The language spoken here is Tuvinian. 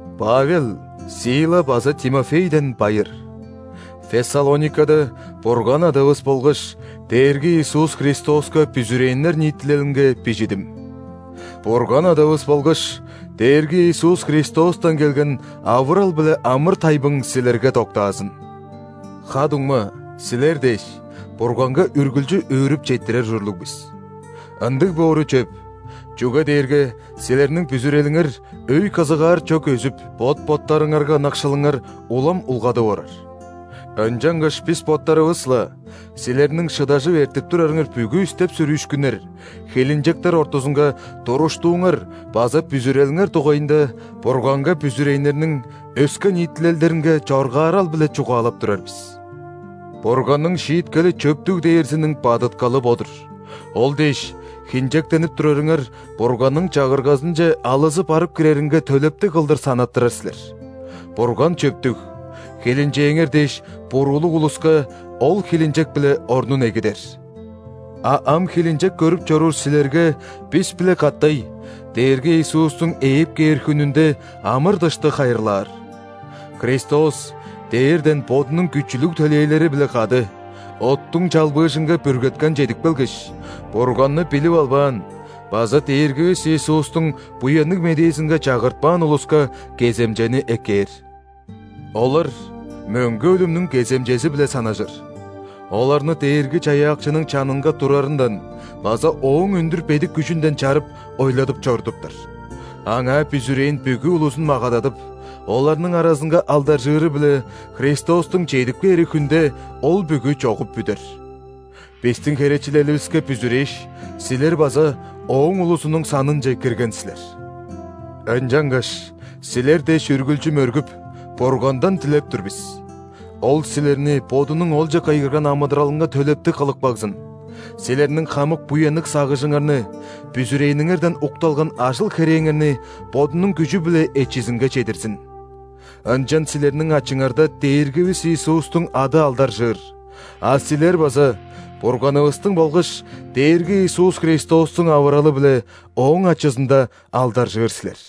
Павел, Сила база Тимофейден байыр. Фессалоникада Бурган Адавыс болгаш Дээрги Иисус Христоска бүзүрээннер ниитилелинге бижидим. Бурган Адавыс болгаш Дээрги Иисус Христостан келген авырал биле амыр-тайбың силерге доктаазын! Ха-дуңма, силер дээш, Бурганга үргүлчү өөрүп четтирер ужурлуг бис. Ындыг боору чөп, чүге дээрге силерниң бүзүрелиңер өй-кызыгаар чок өзүп, бот-боттарыңарга ынакшылыңар улам улгадып орар. Ынчангаш бис боттарывыс-ла силерниң шыдажып эртип турарыңар бүгү истеп-сүрүүшкүннер, хилинчектер ортузунга туруштууңар база бүзүрелиңер дугайында Бурганга бүзүрээннерниң өске ниитилелдеринге чоргаарал-биле чугаалап турар бис. Бурганның шииткели чөптүг дээрзиниң бадыткалы бо-дур: ол дээш, хинчектенип турарыңар Бурганның Чагыргазынче алызы барып киреринге төлептиг кылдыр санаттырар силер. Бурган чөптүг: хилинчээңер дээш буруулуг улуска Ол хилинчек-биле орнун эгидер, а ам хилинчек көрүп чоруур силерге бис-биле катай Дээрги Иисустуң ээп кээр хүнүнде амыр-дышты хайырлаар. Христос дээрден Бодунуң күчүлүг төлээлери-биле кады оттуң чалбыыжынга бүргеткен чедип келгеш, Бурганны билип албаан база Дээргивис Иисустуң Буянныг Медээзинге чагыртпаан улуска кеземчени эккээр. Олар мөңге өлүмнүң кеземчези-биле санажыр: оларны Дээрги-Чаяакчының чанынга турарындан база Ооң өндүр бедик күжүнден чарып, ойладып чорудуптар. Аңаа бүзүрээн бүгү улузун магададып, оларның аразынга алдаржыыры-биле Христостуң чедип кээри хүнде ол бүгү чогуп бүдер. Бистиң херечилеливиске бүзүрээш, силер база Ооң улузунуң санынче кирген силер. Ынчангаш силер дээш үргүлчү мөргүп, Бургандан дилеп тур бис: Ол силерни Бодунуң олче кыйгырган амыдыралынга төлептиг кылып кагзын, силерниң хамык буянныг сагыжыңарны, бүзүрээниңерден укталган ажыл-херээңерни Бодунуң күжү-биле эчизинге чедирзин. Ынчан силерниң ачыңарда Дээргивис Иисустуң ады алдаржыыр, а силер база Бурганывыстың болгаш Дээрги Иисус Христостуң авыралы-биле Ооң ачызында алдаржыыр силер.